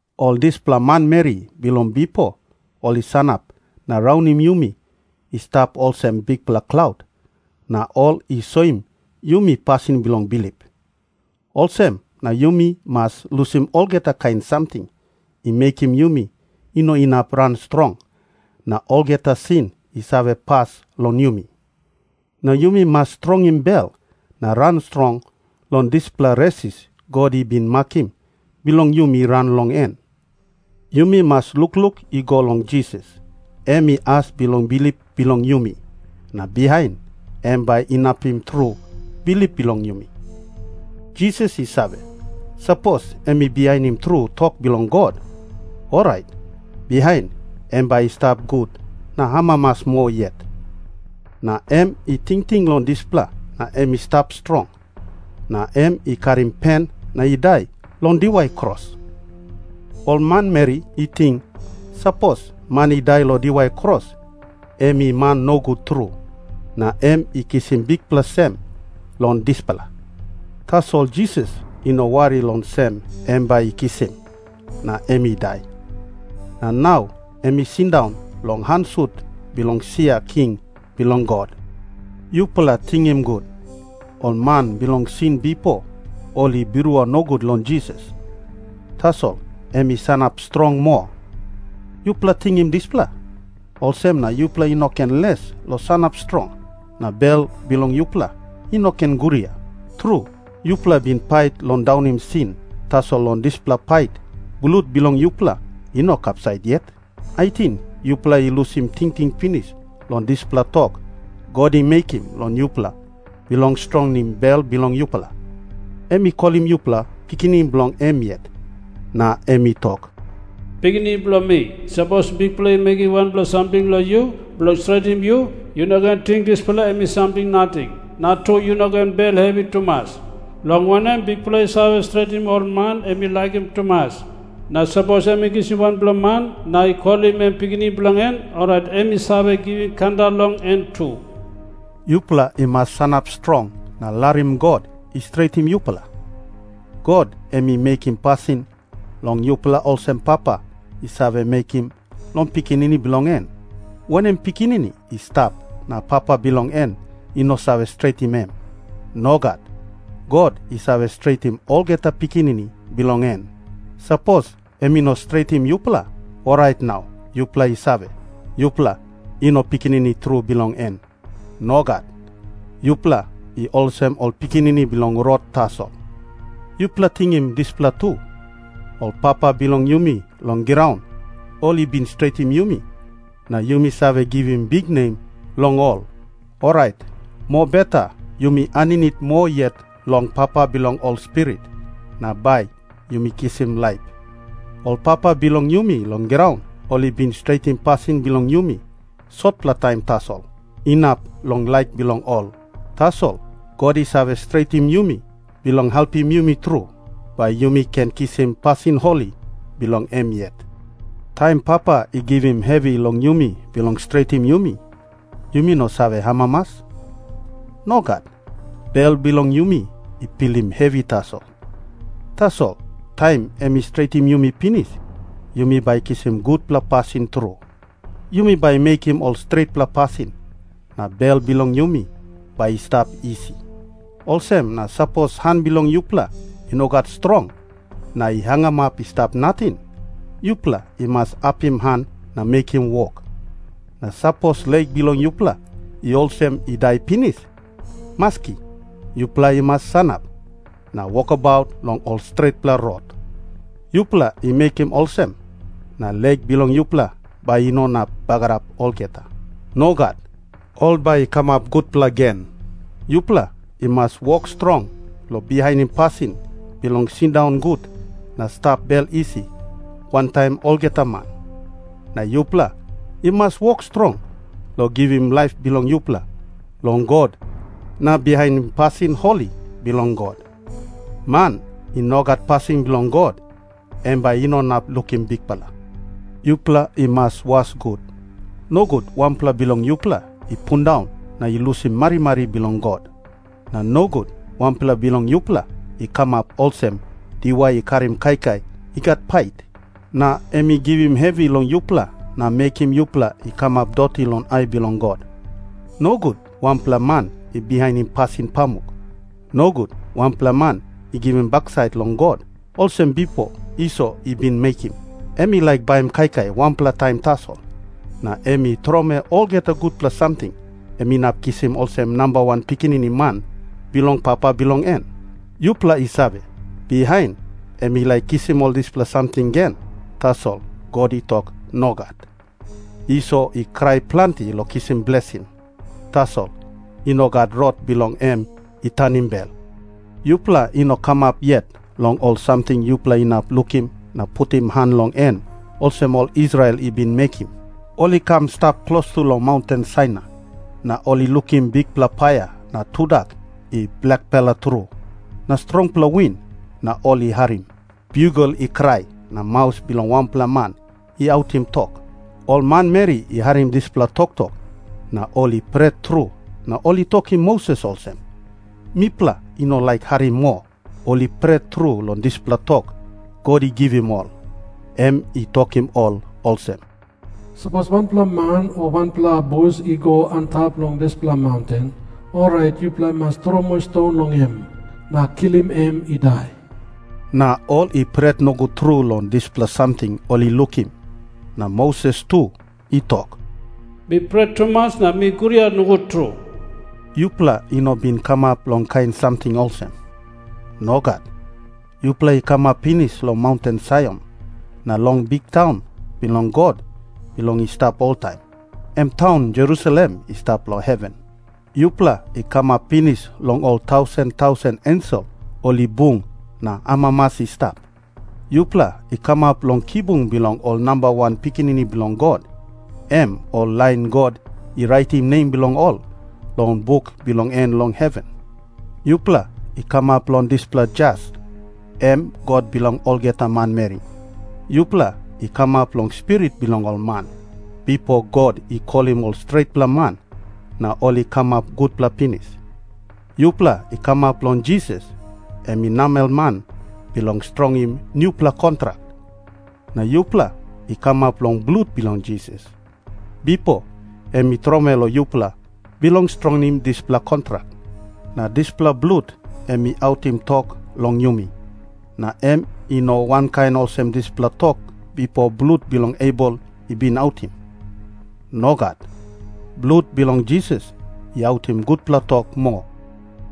Ol dispela manmeri bilong bipo ol i sanap na raunim yumi i stap olsem bikpela klaut, na ol i soim yumi pasin bilong bilip. Olsem na yumi mas lusim olgeta kain samting i mekim yumi i no inap ran strong, na olgeta sin i save pas long yumi. Na yumi mas strongim bel na ran strong long dispela resis God i bin makim bilong yumi ran long en. Yumi mas lukluk i go long Jisas, em i as bilong bilip bilong yumi, na bihain em bai inapim tru bilip bilong yumi. Jisas i save, sapos em i bihainim tru tok bilong God, orait bihain em bai i stap gut na amamas moa yet. Na em i tingting long dispela na em i stap strong, na em i karim pen na i dai long diwai kros. Ol manmeri i ting, sapos man i dai long diwai kros em i man nogut tru, na em i kisim bikpela sem long dispela. Tasol Jisas i no wari long sem em bai i kisim, na em i dai. Na nau em i sindaun long han sut bilong sia king bilong God. Yupela tingim gut. Ol man bilong sin bipo ol i birua nogut long Jisas. Tasol em i sanap strong moa. Yupela tingim dispela, olsem na yupela i no ken les long sanap strong, na bel bilong yupela i no ken guria. Tru, yupela i bin pait long daunim sin, tasol long dispela pait blut bilong yupela i no kapsait yet. Ating yupela i lusim tingting pinis long dispela tok God i mekim long yupela bilong strongim bel bilong yupela? Em i kolim yupela pikinini bilong em yet, na em i tok, “Pikinini bilong mi, sapos Bikpela i mekim wanpela samting long yu bilong stretim yu, yu no ken ting dispela em i samting nating, na tu, yu no ken bel hevi tumas. Long wanem, Bikpela i save stretim ol man em i laikim tumas. Na sapos em i kisim wanpela man na i kolim em pikinini bilong en, orait em i save givim kanda long en tu.” Yupela i mas sanap strong na larim God i stretim yupela. God em i mekim pasin long yupela olsem papa i save mekim long pikinini bilong en. Wanem pikinini i stap na papa bilong en i no save stretim em? Nogat. God i save stretim olgeta pikinini bilong en. Sapos em i no stretim yupela, orait nau yupela i save, yupela i no pikinini tru bilong en. Nogat. Yupela i olsem ol pikinini bilong rot tasol. Yupela tingim dispela tu. Ol papa bilong yumi long graun ol i bin stretim yumi, na yumi save givim biknem long ol. Orait mobeta yumi aninit moa yet long Papa bilong ol spirit, na bai yumi kisim laip. Ol papa bilong yumi long graun ol i bin stretim pasin bilong yumi sotpela taim tasol, inap long laik bilong ol. Tasol God i save stretim yumi bilong helpim yumi tru, bai yumi ken kisim pasin holi bilong em yet. Taim Papa i givim hevi long yumi bilong stretim yumi, yumi no save amamas. Nogat. Bel bilong yumi i pilim hevi tasol. Tasol taim em i stretim yumi pinis, yumi bai kisim gutpela pasin tru. Yumi bai mekim ol stretpela pasin, na bel bilong yumi bai i stap isi. Olsem na sapos han bilong yupela i no gat strong na i hangamap i stap nating, yupela i mas apim han na mekim wok. Na sapos lek bilong yupela i olsem i dai pinis, maski, yupela i mas sanap na wokabaut long ol stretpela rot. Yupela i mekim olsem, na lek bilong yupela bai i no inap bagarap olgeta. Nogat. Ol bai i kamap gutpela gen. Yupela i mas wok strong long bihainim pasin bilong sindaun gut na stap bel isi wantaim olgeta man. Na yupela i mas wok strong long givim laip bilong yupela long God na bihainim pasin holi bilong God. Man i no gat pasin bilong God, em bai i no inap lukim Bikpela. Yupela i mas was gut, nogut wanpela bilong yupela i pundaun na i lusim marimari bilong God. Na nogut wanpela bilong yupela i kamap olsem diwai i karim kaikai i gat pait, na em i givim hevi long yupela na mekim yupela i kamap doti long ai bilong God. Nogut wanpela man i bihainim pasin pamuk. Nogut wanpela man i givim baksait long God, olsem bipo Iso i bin mekim. Em i laik baim kaikai wanpela taim tasol, na em i tromoi olgeta gutpela samting em inap kisim olsem namba wan pikinini man bilong papa bilong en. Yupela i save, bihain em i laik kisim ol dispela samting gen, tasol God i tok nogat. Iso i krai planti long kisim blesing, tasol i no gat rot bilong em i tanim bel. Yupela i no kamap yet long ol samting yupela inap lukim na putim han long en olsem ol Israel i bin mekim. Ol i kam i stap klostu long maunten Sainai, na ol i lukim bikpela paia na tudak i blakpela tru na strongpela win, na ol i harim biugel i krai na maus bilong wanpela man i autim tok. Ol manmeri i harim dispela toktok, na ol i pret tru na ol i tokim Moses olsem, “Mipela i no laik harim moa.” Ol i pret tru long dispela tok God i givim ol. Em i tokim ol olsem, “Sapos wanpela man o wanpela abus i go antap long dispela maunten, orait yupela i mas tromoi ston long em na kilim em i dai.” Na ol i pret nogut tru long dispela samting ol i lukim, na Moses tu i tok, “Mi pret tumas na mi guria nogut tru.” Yupela i no bin kamap long kain samting olsem. Nogat. Yupela i kamap pinis long maunten Saion, na long biktaun bilong God bilong i stap oltaim, em taun Jerusalem i stap long heven. Yupela i kamap pinis long ol tausen tausen ensel ol i bung na amamas i stap. Yupela i kamap long kibung bilong ol namba wan pikinini bilong God, em ol lain God i raitim nem bilong ol long buk bilong en long heven. Yupela i kamap long dispela jas, em God bilong olgeta manmeri. Yupela i kamap long spirit bilong ol man, bipo God i kolim ol stretpela man na ol i kamap gutpela pinis. Yupela i kamap long Jisas, em i namelman bilong strongim nupela kontrak. Na yupela i kamap long blut bilong Jisas, bipo em i tromoi long yupela bilong strongim dispela kontrak. Na dispela blut em i autim tok long yumi, na em i no wankain olsem dispela tok bipo blut bilong Abel i bin autim. Nogat. Blut bilong Jisas i autim gutpela tok moa.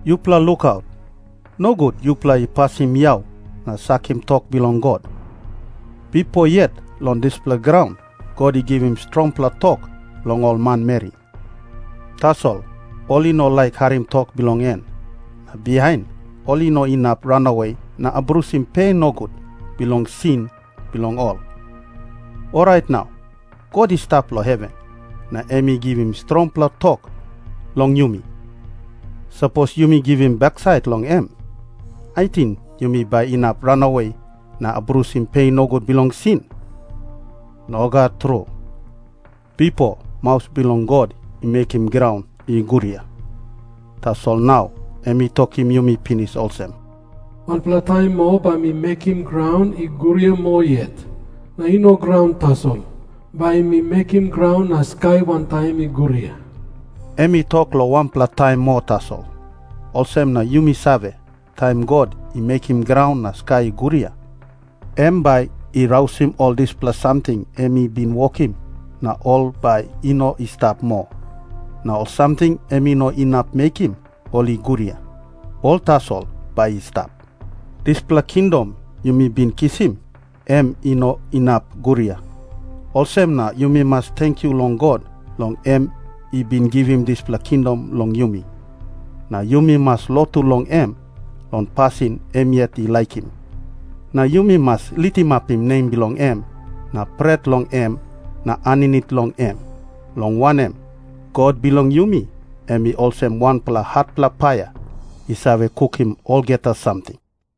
Yupela lukaut, nogut yupela i pasim yau na sakim tok bilong God. Bipo yet long dispela graun God i givim strongpela tok long ol manmeri. Tasol ol i no laik harim tok bilong en, na bihain ol i no inap ranawe na abrusim pe nogut bilong sin bilong ol. Orait nau God i stap long heven na em i givim strongpela tok long yumi. Sapos yumi givim baksait long em, ating yumi bai inap ranawe na abrusim pe nogut bilong sin? Nogat tru. Bipo maus bilong God i mekim graun i guria. Tasol nau em i tokim yumi pinis olsem, “Wanpela taim moa bai mi mekim graun i guria moa yet. Na i no graun tasol. Bai mi mekim graun na skai wantaim i guria.” Em i tok long wanpela taim moa tasol, olsem na yumi save, taim God i mekim graun na skai i guria, em bai i rausim ol dispela samting em i bin wokim na ol bai i no i stap moa. Na ol samting em i no inap mekim ol i guria, ol tasol bai i stap. Dispela kingdom yumi bin kisim, em i no inap guria. Olsem na yumi mas tenkyu long God long em i bin givim dispela kingdom long yumi. Na yumi mas lotu long em long pasin em yet i laikim. Na yumi mas litimapim nem bilong em na pret long em na aninit long em, long wanem, God bilong yumi em i olsem wanpela hatpela paia i save kukim olgeta samting.